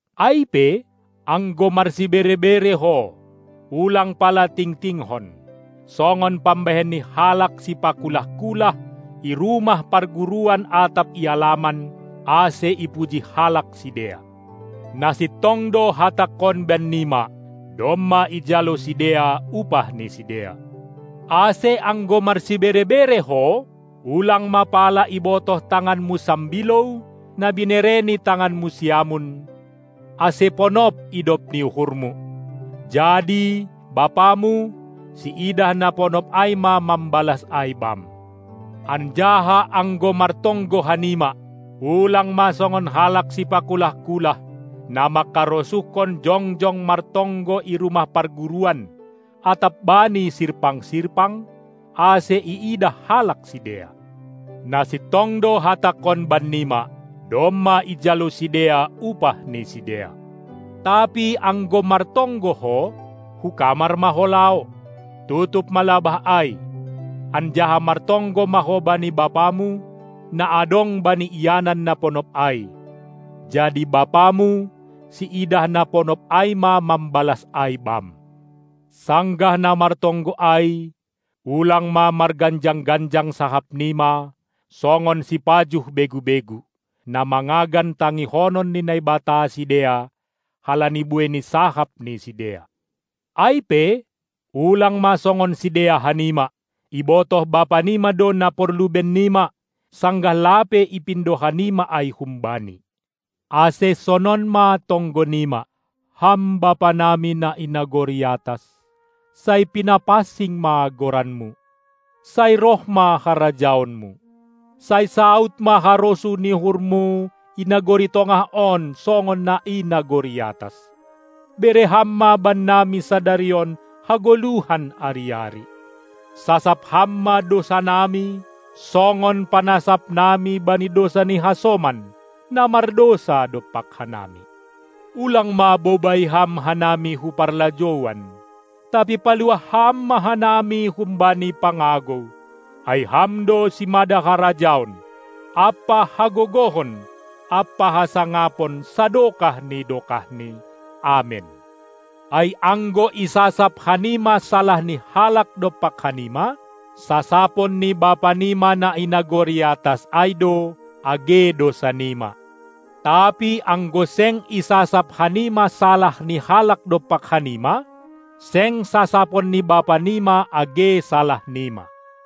Ai pe, anggo marsibere-bere ho, ulang pala tingtingkon, songon pambahen ni halak sipakulah-kulah i rumah parguruan atap i alaman, ase ipuji halak sidea. Na sintong do Hatangkon bannima: Domma ijalo sidea upah ni sidea. Ase anggo marsibere-bere ho, ulang ma pala ibotoh tanganmu sambilou na binere ni tanganmu siamun, ase ponop idop ni uhurmu; jadi Bapamu, siidah na ponop ai ma mambalas ai bam. Anjaha anggo martonggo hanima, ulang ma songon halak sipakulah-kulah, na mangkarosuhkon jongjong martonggo i rumah parguruan atap bani sirpang-sirpang, ase iidah halak sidea. Na sintong do Hatangkon bannima: Domma ijalo sidea upah ni sidea. Tapi anggo martonggo ho, hu kamar ma ho laho, tutup ma labah ai, anjaha martonggo ma ho bani Bapamu, na adong bani ianan na ponop ai; jadi Bapamu, siidah na ponop ai ma mambalas ai bam. Sanggah na martonggo ai ulang ma marganjang-ganjang sahapnima songon sipajuh begu-begu, na mangagan tangihonon ni Naibata sidea, halani buei ni sahap ni sidea. Ai pe, ulang ma songon sidea hanima! Ibotoh Bapanima do na porlu bennima, sanggah lape ipindo hanima ai hum-Bani. Ase sonon ma tonggonima: Ham Bapanami na i nagori atas. Sai pinapansing ma Goranmu. Sai roh ma harajaonMu. Sai saud ma harosuh ni uhurMu i nagori tongah on songon na i nagori atas. Bere Ham ma bannami sadari on hagoluhan ari-ari. Sasap Ham ma dousanami songon panasapnami bani dousa ni hasoman, na mardousa dompak hanami. Ulang ma bobai Ham hanami hu parlajouan, tapi paluah Ham ma hanami humbani pangagou. Ai Ham do simada harajaon ampa hagogohon ampa hasangapon sadokah ni dokahni. Amen. Ai anggo isasap hanima salah ni halak dompak hanima, sasapon ni Bapanima na i nagori atas ai do age dousanima. Tapi anggo seng isasap hanima salah ni halak dompak hanima, seng sasapon ni Bapanima age salahnima.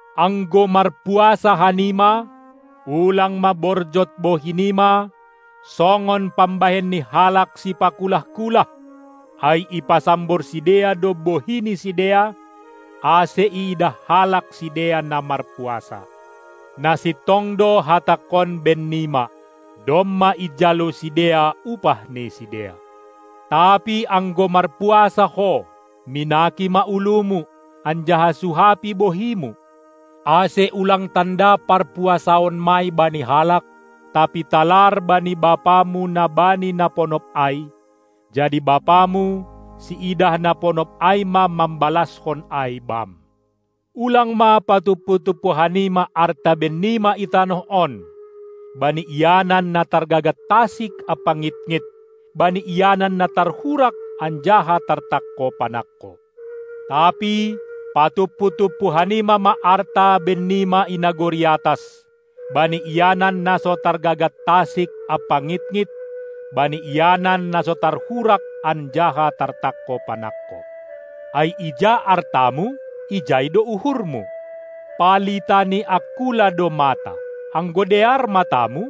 Anggo marpuasa hanima, ulang ma borjot bohinima songon pambahen ni halak sipakulah-kulah, ai ipasambor sidea do bohi ni sidea, ase iidah halak sidea na marpuasa. Na sintong do hatangkon bennima: Domma ijalo sidea upah ni sidea. Tapi anggo marpuasa ho, minaki ma ulumu, anjaha suhapi bohimu, ase ulang tanda parpuasaanmai bani halak, tapi talar bani Bapamu na bani na ponop ai. Jadi Bapamu, siidah na ponop ai ma mambalaskon ai bam. Ulang ma patumpu-tumpu hanima arta bennima i tanoh on, bani ianan na targagat tasik ampa ngitngit, bani ianan na tarhurak anjaha tartangko panangko! Tapi patumpu-tumpu hanima ma arta bannima i nagori atas, bani ianan na so targagat tasik ampa ngitngit, bani ianan na so tarhurak anjaha tartangko panangko. Ai ija artamu, ijai do uhurmu. Palita ni angkula do mata. Anggo dear matamu,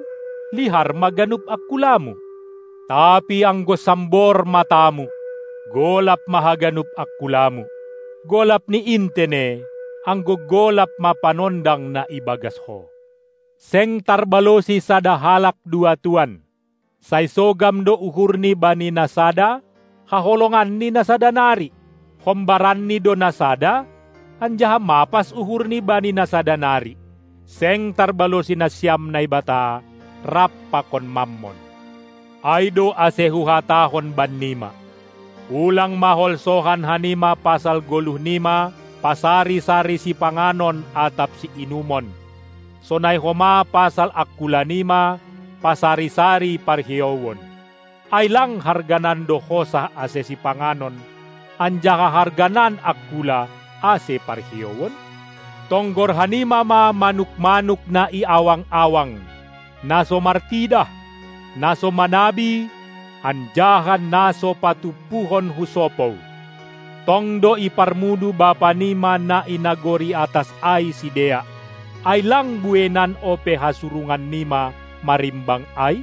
lihar ma ganup angkulamu. Tapi anggo sambor matamu, golap ma haganup angkulamu. Golap ni in tene, anggo golap ma panondang na ibagas ho. Seng tarbalosi sada halak dua tuan. Sai sogam do uhurni bani na sada, haholonganni na sada nari; hombaranni do na sada, anjaha mapas uhurni bani na sada nari. Seng tarbalosi nasiam Naibata rap pakon Mammon! Ai do ase Huhatahon bannima: Ulang ma holsohan hanima pasal goluhnima pasari-sari sipanganon atap siinumon, sonai homa pasal angkulanima pasari-sari parhiouon. Ai lang harganan do hosah ase sipanganon, anjaha harganan angkula ase parhiouon? Tonggor hanima ma manuk-manuk na i awang-awang, na so martidah, na so manabi anjaha na so patumpuhon hu sopou; tong do iparmudu Bapanima na i nagori atas ai sidea. Ai lang bueinan ope hasurungannima marimbang ai?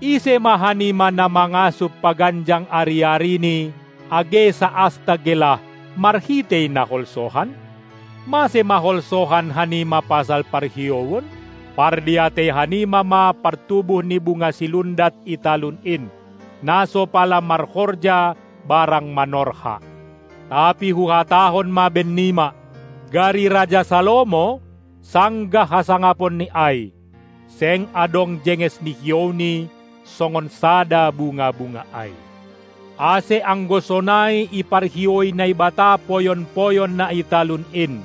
Ise ma hanima na mangasup paganjang ari-arini age saasta gelah marhitei na holsohan? Mase ma holsohan hanima pasal parhiouon? Pardiatei hanima ma partubuh ni bunga silundat i talun in, na so pala marhorja barang manorha! Tapi Huhatahon ma bennima: Gari raja Salomo, sanggah hasangaponni ai, seng adong jenges ni hiouni songon sada bunga-bunga ai. Ase anggo sonai iparhioui Naibata poyon-poyon na i talun in,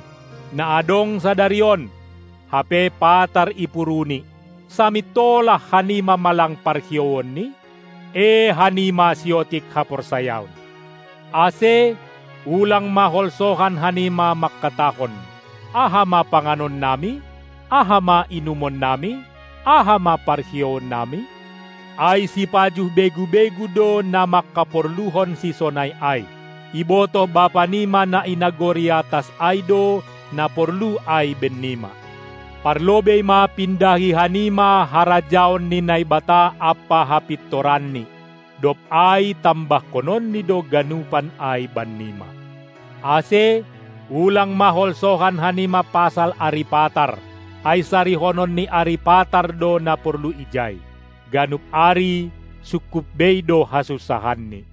na adong sadari on, hape patar ipuruni, samintolah hanima ma lang parhiouonni? Ee hanima siotik haporsayaon! Ase ulang ma holsohan hanima mangkatahon: Aha ma panganonnami, aha ma inumonnami, aha ma parhiouonnami? Ai sipajuh begu-begu do na mangkaporluhon sisonai ai. Ibotoh Bapanima na i nagori atas ai do na porlu ai bennima. Parlobei ma pindahi hanima harajaon ni Naibata ampa hapintoranNi, dob ai tambahkononNi do ganupan ai bannima. Ase ulang ma holsohan hanima pasal ari patar, ai sarihonon ni ari patar do na porlu ijai. Ganup ari sungkup bei do hasunsahanni.